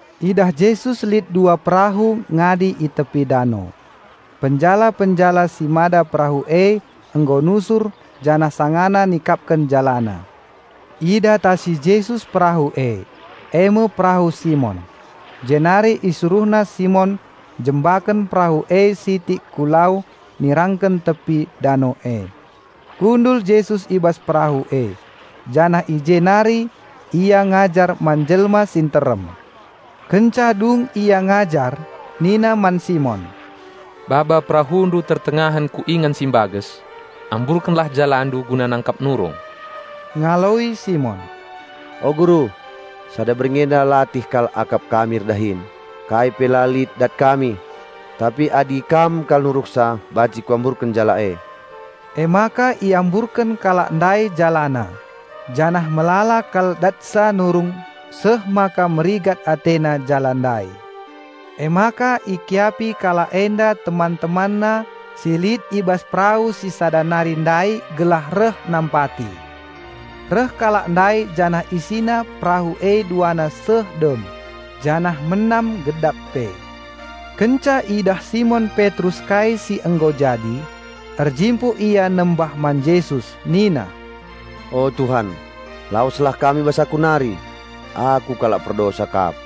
Idah Jesus lit dua perahu ngadi i tepi dano; penjala-penjala si mada perahu e nggo nusur janah sangana nikapken jalana. Idatasi Jesus perahu e, e me perahu Simon; jenari IsuruhNa Simon njembaken perahu e sitik ku lau nirangken tepi dano e. Kundul Jesus i bas perahu e, janah i jenari Ia ngajar man jelma si nterem. Kenca dung Ia ngajar nina man Simon, "Baba perahundu tertengahen ku ingan si mbages. Amburkenlah jalandu guna nangkap nurung." Ngaloi Simon, "O Guru, sada berngi enda latih kal akap kami erdahin, kai pe la lit dat kami! Tapi adi Kam kal nuruhsa banci kuamburken jala e." Emaka iamburken kalak ndai jalana janah melala kal datsa nurung seh maka merigat atena jala ndai. Emaka ikiapi kalak enda teman-temanna si lit i bas perahu si sada nari ndai gelah reh nampati. Reh kalak ndai janah isina perahu e duana seh dem, janah menam gedap pe. Kenca idah Simon Petrus kai si nggo jadi, erjimpuh ia nembah man Jesus nina, "O Tuhan, laweslah Kam i bas aku nari! Aku kalak perdosa kap!"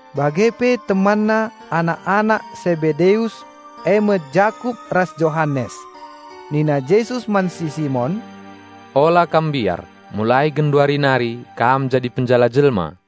Bagepe temanna anak-anak Sebedeus eme Jakup ras Johanes. Nina Jesus man si Simon, "Ola kam mbiar, mulai genduari nari kam jadi penjala jelma."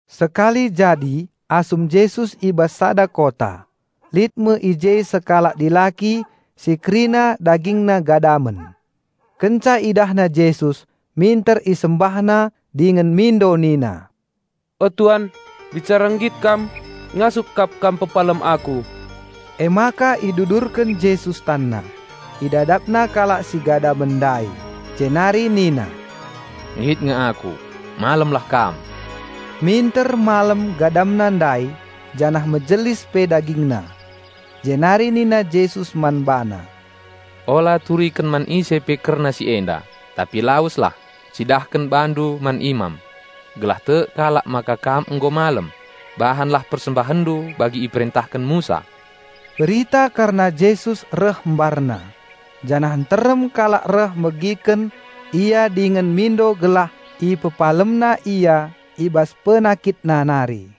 Sekali jadi asum Jesus i bas sada kota, lit me i je sekalak dilaki si kerina dagingna gadamen. Kenca idahna Jesus, minter isembahna dingen mindo nina, "O, Tuan, bicara nggit Kam, ngasup kap Kam pepalem aku!" Emaka idudurken Jesus TanNa, IdadapNa kalak si gadamen ndai, jenari nina, "Nggit nge Aku, malemlah kam!" Minter malem gadamna ndai janah mejelis pe dagingna. Jenari nina Jesus man bana, "Ola turiken man ise pe kerna si enda, tapi laweslah, cidahken bandu man imam. Gelah tek kalak maka kam nggo malem, bahanlah persembahenndu bagi iperentahen Musa." Berita kerna Jesus reh mbarna, janah nterem kalak reh megiken Ia dingen mindo gelah IpepalemNa ia i bas penakitna nari.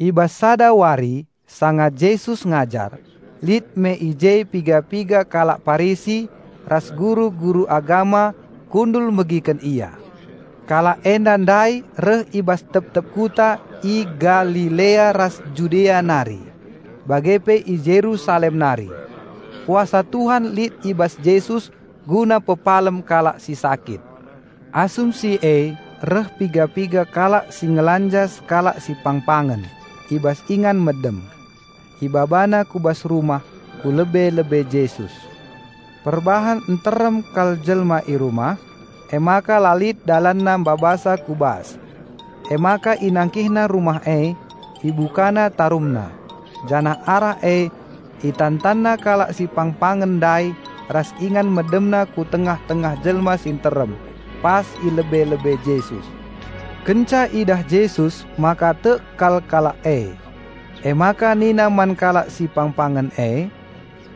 I bas sada wari sanga Jesus ngajar, lit me i je piga-piga kalak Parisi ras guru-guru agama kundul megiken Ia. Kalak enda ndai reh i bas tep-tep kuta i Galilea ras Judea nari, bage pe i Jerusalem nari. Kuasa Tuhan lit i bas Jesus guna pepalem kalak si sakit. Asum si e reh piga-piga kalak si ngelanja sekalak si pangpangen i bas ingan medem. Ibabana ku bas rumah, ku lebe-lebe Jesus. Perbahan nterem kal jelma i rumah, emaka la lit dalanna mbabasa ku bas. Emaka inangkihna rumah e, ibukana tarumna, janah arah e itantanna kalak si pangpangen ndai ras ingan medemna ku tengah-tengah jelma si nterem pas i lebe-lebe Jesus. Kenca idah Jesus maka tek kal kalak e, emaka nina man kalak si pangpangen e,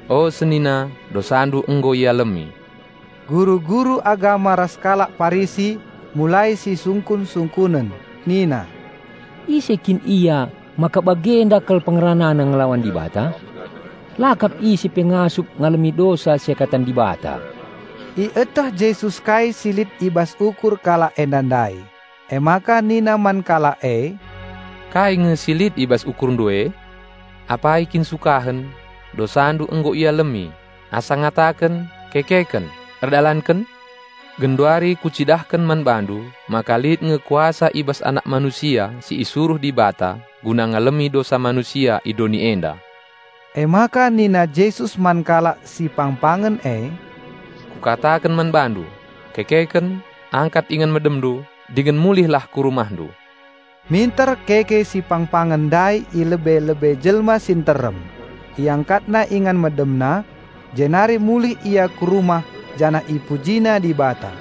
"O senina, dosandu nggo ialemi." Guru-guru agama ras kalak Parisi mulai sisungkun-sungkunen, nina, "Ise kin Ia maka bagenda kal PengeranaNa ngelawan Dibata? La kap ise pe ngasup ngalemi dosa seakatan Dibata!" Ieteh Jesus kai si lit i bas ukur kalak enda ndai, emaka nina man kalak e, "Kai nge si lit i bas ukurndu e? Apai kin sukahen, 'Dosandu nggo ialemi,' asa ngataken, 'Kekeken, erdalanken!'? Genduari Kucidahken man bandu maka lit nge kuasa i bas Anak Manusia si isuruh Dibata guna ngalemi dosa manusia i doni enda." Emaka nina Jesus man kalak si pangpangen e, "Kukataken man bandu: Kekeken, angkat ingan medemndu, dingen mulihlah ku rumahndu." Minter keke si pangpangen ndai i lebe-lebe jelma si nterem, iangkatna ingan medemna, jenari mulih ia ku rumah janah ipujina Dibata.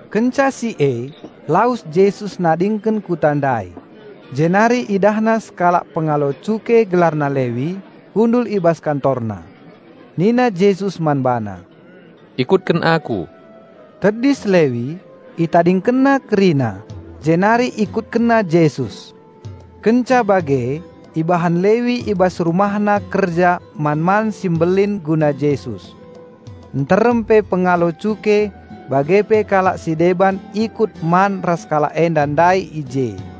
Kenca si e, lawes Jesus nadingken kuta ndai, jenari IdahNa sekalak pengalo cuke, gelarna Lewi, kundul i bas kantorna. Nina Jesus man bana, "Ikutken Aku." Tedis Lewi, itadingkenna kerina, jenari ikutkenna Jesus. Kenca bage, ibahan Lewi i bas rumahna kerja man-man si mbelin guna Jesus. Nterem pe pengalo cuke bage pe kalak si deban ikut man ras kalak enda ndai i je.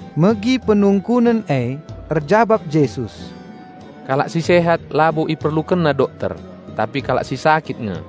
Megi penungkunen e, erjabap Jesus, "Kalak si sehat labo iperlukenna dokter, tapi kalak si sakit nge.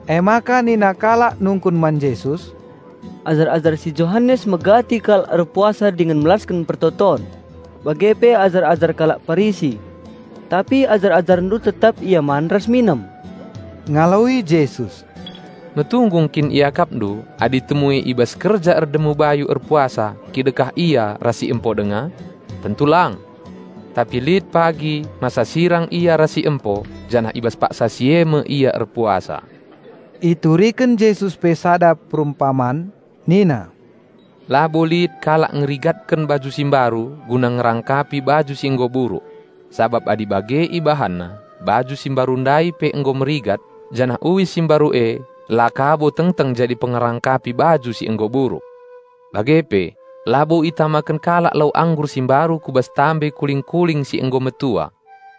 Emaka nina kalak nungkun man Jesus, "Ajar-ajar si Johanes megati kal erpuasa dingen melasken pertoton, bage pe ajar-ajar kalak Parisi; tapi ajar-AjarNdu tetap ia man ras minem." Ngaloi Jesus, "Metunggung kin iakapndu adi temue i bas kerja erdemu bayu erpuasa kidekah ia ras si empo denga? Tentu lang! Tapi lit pagi masa sirang ia ras si empo, janah i bas paksa si e me ia erpuasa." Ituriken Jesus pe sada perumpaman nina, "Labo lit kalak ngerigatken baju si mbaru guna ngerangkapi baju si nggo buruk. Sabap adi bage ibahanna, baju si mbaru ndai pe nggo merigat, janah uis si mbaru e la kabo tengteng jadi pengerangkapi baju si nggo buruk. Bage pe labo itamaken kalak lau anggur si mbaru ku bas guci si nggo regat.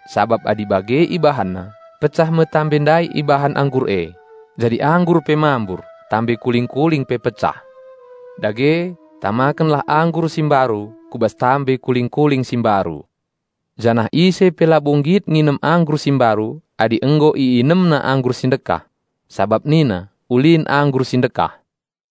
Sabap adi bage ibahanna, pecah me guci ndai ibahan anggur e; jadi anggur pe mambur, guci pe pecah. Dage, tamakenlah anggur si mbaru kubas guci si mbaru! Janah ise pe labo nggit nginem anggur si mbaru adi nggo iinemna anggur si ndekah. Sabap nina, 'Ulin anggur si ndekah.'"